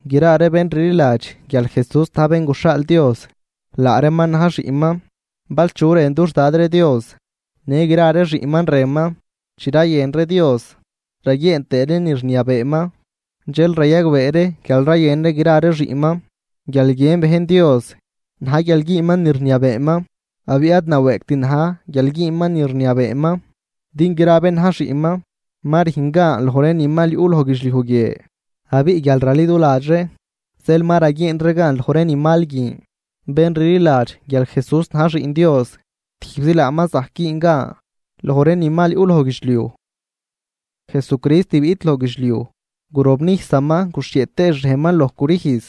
Gra ree bén rliladx guial Jesús na̱j bén guxhaal Dios, laa reeman na̱j xiꞌnman. Bal chu rën dux Dad ree Dios, në gra ree xiꞌnman rënman. Chi rayën ree Dios raguieen tëë ree ni rniabeeman, dxel rayagbee ree guial rayën ree gra ree xiꞌnman. Guial guiën bejn Dios na̱j guial güünman ni rniabeeman. Abiꞌ ad nawëëgt na̱j guial güünman ni rniabeeman, din gra bén na̱j xiꞌnman ma rüjn gan loj ree ni mal yuꞌ loj guidxliuj guie. Abiꞌ guial raliduladx ree, zeel ma raguieen ree gan loj ree ni mal guin. Bén rliladx guial Jesús na̱j Xiꞌn Dios, tijbzi laaman zajc güün gan loj ree ni mal yuꞌ loj guidxliuj. Jesucrist biꞌt loj guidxliuj, gurobnijsaman guxhieꞌ tëë xrejnman loj crüjz.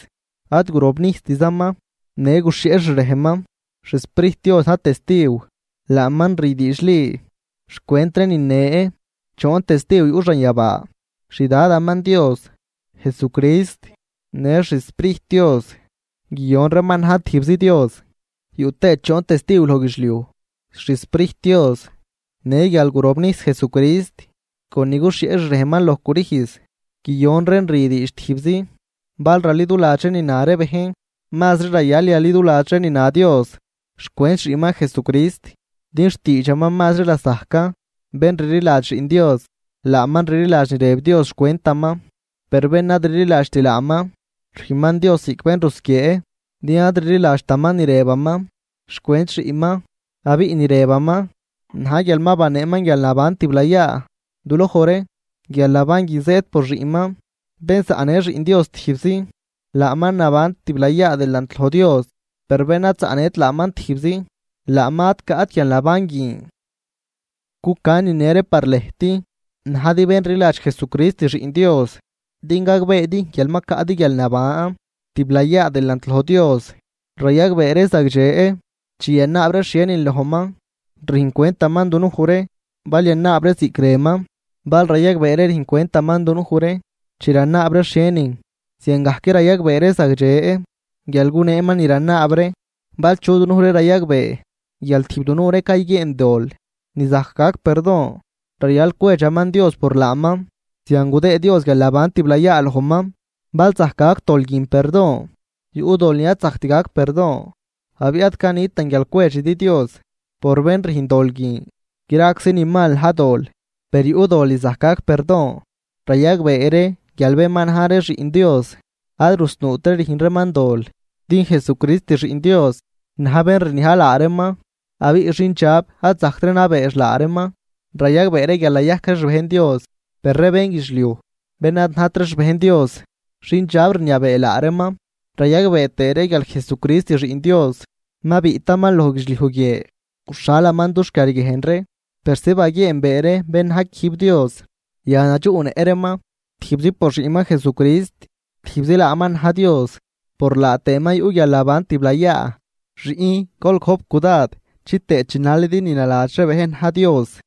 Ad gurobnijstzaman, në guxhieꞌ xrejnman. XSprijt Dios na̱j testiw, laaman rü diidxli xcwent ree nine. Choon testiw yuꞌ xanyabaa: xDadaman Dios, Jesucrist në xSprijt Dios, guiyon reeman na̱j tijbzi Dios. Yuꞌ tëë choon testiw loj guidxliuj: XSprijt Dios, në guial gurobnijs Jesucrist con ni guxhieꞌ xrejnman loj crüjz, guiyon reen rü diidx tijbzi. Bal raliduladx ree ni na ree bejn, mazri rayal yaliduladx ree ni na Dios xcwent xiꞌnman Jesucrist, din xtiidxaman mazri lasajcan. Bén rliladx Xiꞌn Dios, laaman rliladx ni rëb Dios xcwentaman. Per bén ad rliladxt laaman, rüjnman Dios ziꞌc bén rusquiee, din ad rliladxtaman ni rëbaman xcwent Xiꞌnman. Abiꞌ ni rëbaman na̱j guial ma baneeman guialnaban tiblayaa duloj ree, guialnaban guin zëëd por xiꞌnman. Bén zaꞌnë Xiꞌn Dios tijbzi, laaman naban tiblayaa delant loj Dios, per bén ad zaꞌnët laaman tijbzi, laaman ad caꞌt guialnaban guin. Cucan nine ree par lëjt najdi bén rliladx Jesucrist Xiꞌn Dios din gagbeedi guial ma caꞌdi guialnaban tiblayaa delant loj Dios. Rayagbee ree zagdxe: chi yanaab ree xhienin lojman, rüjncwentaman dunuj ree, bal yanaab ree ziꞌc rënman. Bal rayagbee ree rüjncwentaman dunuj ree chi ranaab ree xhienin, ziangajc rayagbee ree zagdxe guial guneeman ni ranaab ree. Bal chu dunuj ree rayagbee guial tijb dunuj ree cayguieen dol ni zajc gac perdon, rayal cwedxaman Dios por laaman zian gudëë Dios guialnaban tiblayaa lojman, bal zajc gac dol guin perdon. Yuꞌ dol ni ad zajct gac perdon, abiꞌ ad canitan guial cwedxidi Dios por bén rüjn dol guin. Graczi ni mal na̱j dol, per yuꞌ dol ni zajc gac perdon. Rayagbee ree guial bén ma na̱j ree xiꞌn Dios ad rusnuutri rüjn reeman dol, din Jesucrist Xiꞌn Dios na̱j bén rniaj laa reeman, abiꞌ xindxab ad zajctri nabeex laa reeman. Rayagbee ree guial nayajc ree xbejn Dios, per ree bénguidxliuj, bén ad najt ree xbejn Dios, xindxab rniabee laa reeman. Rayagbee tëë ree guial Jesucrist Xiꞌn Dios ma biꞌtaman loj guidxliuj guie, guxhalaman dux quiarguiejn ree, persi baguieenbee ree bén na̱j quijb Dios. Yan nadxuꞌnëꞌ reeman tijbzi por Xiꞌnman Jesucrist. Tijbzi laaman na̱j Dios, por laa tëëman yuꞌ guialnaban tiblayaa. Xiꞌn, gol gojp cudad chitëë chinalidi ni naladx ree bejn na̱j Dios.